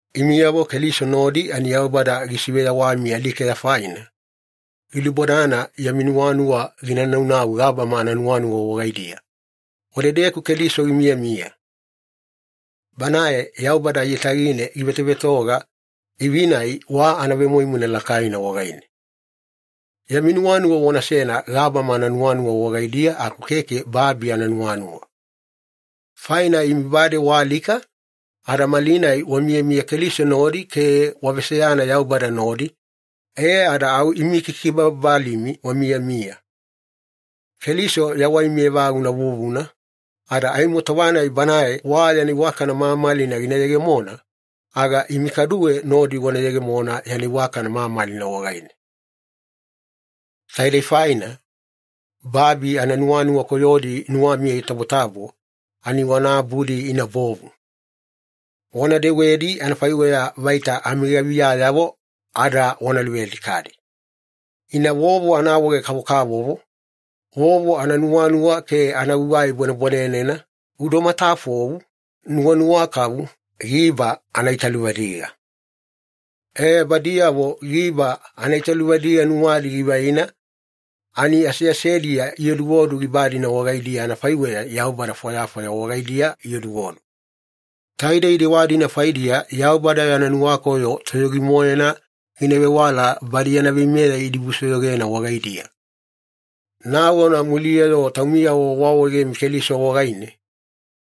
Imiyavo Keliso nodi ani Yaubada gisiveyawami alikeya faina, gilubodana yami nuwanuwa gina naunau gabama ananuwanuwa wagaidiya, wadedeku Keliso gimiyamiya. Banae Yaubada aiyatagine givetovetoga, ivi-nai wa anavemoimoina lakaina wagaine. Yami nuwanuwa wanasena gabama ananuwanuwa wagaidiya aku keke babi ananuwanuwa. Faina imi bade waalika ada malinai wamiyamiya Keliso nodi ke waveseyana Yaubada nodi, e ada au imi kikibababalimi wamiyamiya. Keliso yawaimi evaguna vuvuna, ada aimo tova-nai Banae wa yana iwakana mamalina gina yegemona, aga imi kaduwe nodi wana yegemona yana iwakana mamalina wagaine. Taidei faina, babi ananuwanuwa koyodi nuwamiya itabotabo ani wana abudi ina bovu. Wana dewedi anafaiweya vaita amigaviyayavo ada wana luvealikadi. Ina vovo anaawaege-kavokavovo, vovo ananuwanuwa ke anagugai bwanebwanenena, udo matafou, nuwanuwa kavu, giba anaitaluvadiga. E, badiyavo giba anaitaluvadiga nuwadi givaina ani aseasediya ioduodu giba-dina wagaidiya anafaiweya yaubada fwayafwaya wagaidiya ioduodu. Taidei dewa-dina faidiya Yaubada yana nuwakoyo toyogi-moena gina vewala badi yana veimeya idibusoyogena wagaidiya. Nagona muliya-yo taumiyavo waawaegemi Keliso wagaine,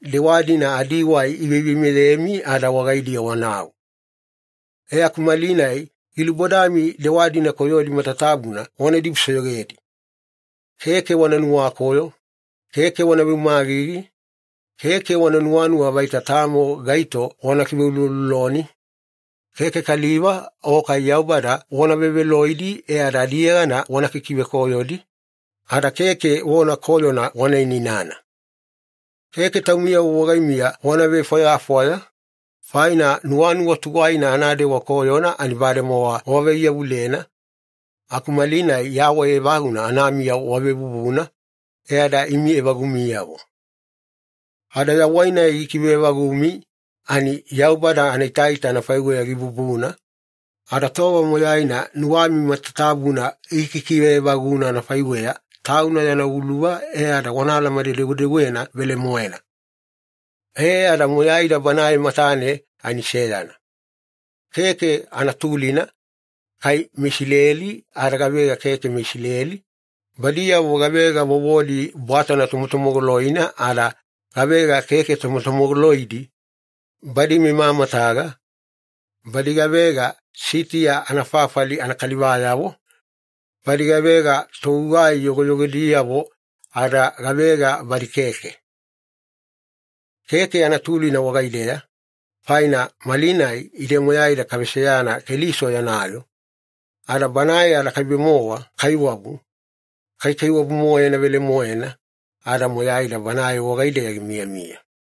dewa-dina adiwai iveiveimeyemi ada wagaidiya wanau. E aku malinai gilubodami dewa-dina koyodi matatabuna wana dibusoyogedi. Keke wana nuwakoyo, keke wana veumagigi, keke wana nuwanuwa vaita tamo gaito wana kiveulouloloni, keke kaliva o kai Yaubada wana veveloidi e ada adiyegana wana ikikivekoyodi, ada keke vona koyona wana inainana. Keke taumiyavo wagaimiya wana vefwayafwaya, faina nuwanuwa tuwaina anadewa koyona ani bademowa wavaiyavulena aku malinai yawai evaguna anamiya wavevuvuna, e ada imi evagumiyavo. Ada yawai-nai gikive evagumi ani Yaubada anaitaita anafaiweya gibubuna, ada tova moyaina nuwami matatabuna gikikive evaguna anafaiweya Tauna yana uluva e ada wana alamane-dewedewena velemoena. E ada moyaida Banae matane ani seyana. Keke anatulina kai meIsileli ada gavega keke meIsileli, badiyavo gavega vovodi bwatana tomotomogoloina ada gavega keke tomotomogoloidi, badi memamataga, badi gavega Sitiya anafafali anakalivayavo, badi gavega togugai yogoyogodiyavo ada gavega badi keke. Keke anatulina wagaideya, faina malinai ide moyaida kaveseyana Keliso yana yoo, ada Banae anakaibe-mowa kaiwabu, kaikaiwabu-moena velemoena, ada moyaida Banae wagaideya gimiyamiya.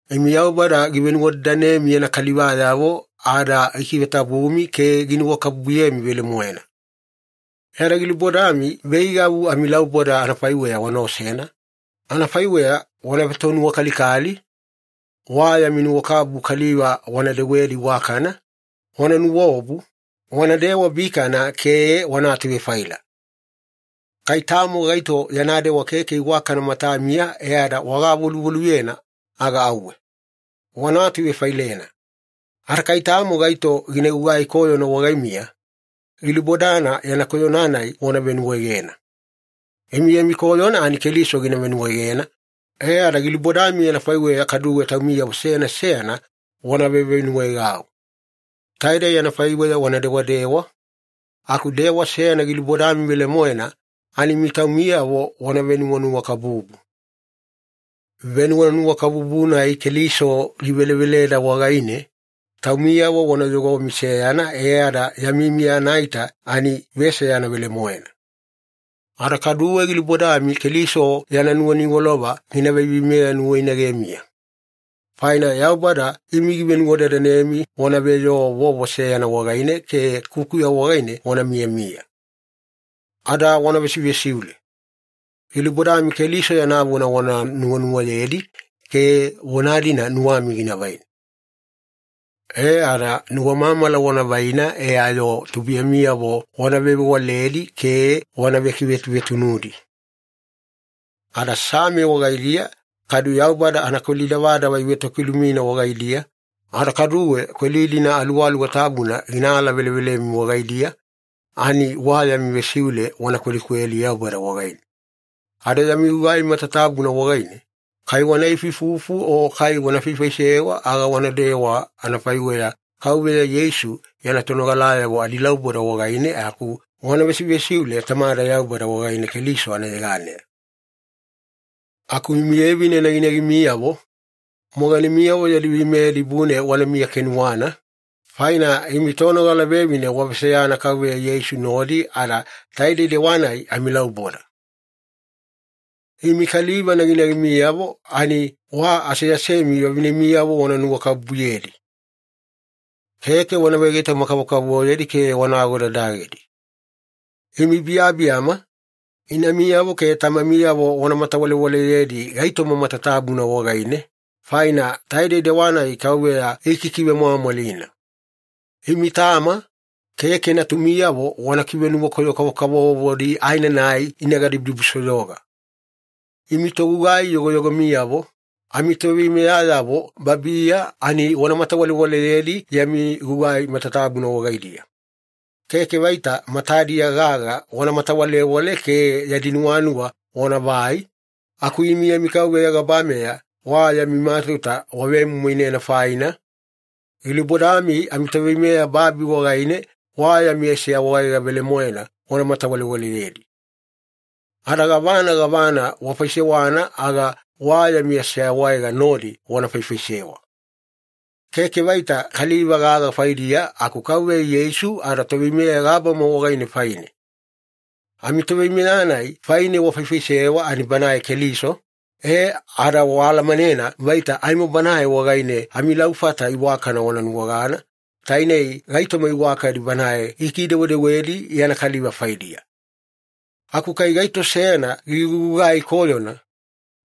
Imi Yaubada givenuwadadanemi yana kalivayavo ada gikivetabumi ke ginuwakabubuyemi velemoena. E ada gilubodami veigavu amilauboda anafaiweya wana osena, anafaiweya wana vetonuwakalikali, wa yami nuwakabubu kaliva wana dewedi iwakana, wana nuwaobu, wana dewabikana, ke wana atuvefaila. Kai tamo gaito yana dewa keke iwakana matamiya e ada wagavoluvoluyena, aga auwe. Wana atuvefailena. Ada kai tamo gaito gina gugai koyona wagaimiya, gilubodana yana koyona-nai wana venuwaegena. Imi yami koyona ani Keliso givenuwaegena, e ada gilubodami anafaiweya kaduwe taumiyavo seyana seyana wana vevenuwaegau. Taidei anafaiweya wana dewadewa, aku dewa seyana gilubodami velemoena ani imi taumiyavo wana venuwanuwakabubu. Venuwanuwakabubu-nai Keliso giveleveleda wagaine, taumiyavo wana yogomi seyana e ada yami miya anaita ani veseyana velemoena. Ada kaduwe gilubodami Keliso yana nuwaniwalova gina veiveimeya nuwainagemiya. Faina Yaubada imi givenuwadadanemi wana veyoo vovo seyana wagaine ke kukuya wagaine wana miyamiya. Ada wana vesivesiule. Gilubodami Keliso yana vona wana nuwanuwayedi ke vona-dina nuwami gina vaina. E ada nuwamamala wana vaina e ayo tubuiyamiyavo wana vewavewaledi ke wana vekivetuvetunudi. Ada Same wagaidiya kadu Yaubada anakweli davadava ivetokilumina wagaidiya, ada kaduwe kweli-dina Aluwaluwa Tabuna gina alavelevelemi wagaidiya, ani wa yami vesiule wana kwelikweli Yaubada wagaine. Ada yami gugai matatabuna wagaine, kai wana ifuifufu o kai wana faifaisewa, aga wanadewa anafaiweya Kauveya Yeisu yana tonogalayavo adilauboda wagaine aku wana vesivesiule Tamada Yaubada wagaine Keliso anayeganeya. Aku imi vevine naginagimiyavo, moganemiyavo yadi veimeya dibune wanamiya kenuwana, faina imi tonogala vevine waveseyana Kauveya Yeisu nodi ada taidei dewa-nai amilauboda. Imi kaliva naginagimiyavo ani wa aseasemi vavinemiyavo wana nuwakabubuyedi. Keke wana vegaitoma-kavokavovoyedi ke wana agodadagedi. Imi biyabiyama, inamiyavo ke tamamiyavo wana matawalewaleyedi gaitoma matatabuna wagaine, faina taidei dewa-nai Kauveya gikikivemwamwalina. Imi tama, keke natumiyavo wana kivenuwakoyo-kavokavovodi aenanai ina gadibudibusoyoga. Imi togugai yogoyogomiyavo, amitoveimeyayavo babiya ani wana matawalewaleyedi yami gugai matatabuna wagaidiya. Keke vaita matadiya gaga wana matawalewale ke yadi nuwanuwa wanavai, aku imi yami Kauveya gabameya wa yami matauta wavemoimoinena faina, gilubodami amitoveimeya babi wagaine wa yami aseawaega velemoena wana matawalewaleyedi. Ada gavana gavana wafaisewana aga wa yami aseawaega nodi wana faifaisewa. Keke vaita kaliva gaga faidiya, aku Kauveya Yeisu adaToveimeya gabama wagaine faine. Amitoveimeya-nai faine wafaifaisewa ani Banae Keliso, e ada waalamanena vaita aimo Banae wagaine amilaufata iwakana wana nuwagana, taine gaitoma iwakadi Banae gikidewedewedi yana kaliva faidiya. Aku kai gaito seyana gigugugai koyona,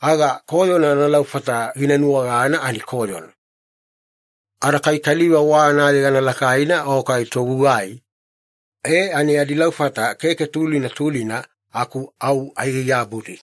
aga koyona analaufata gina nuwagana ani koyona. Ada kai kaliva wa anayegana lakaina o kai togugai, e ani adilaufata keke tulina tulina aku au aigaigabudi.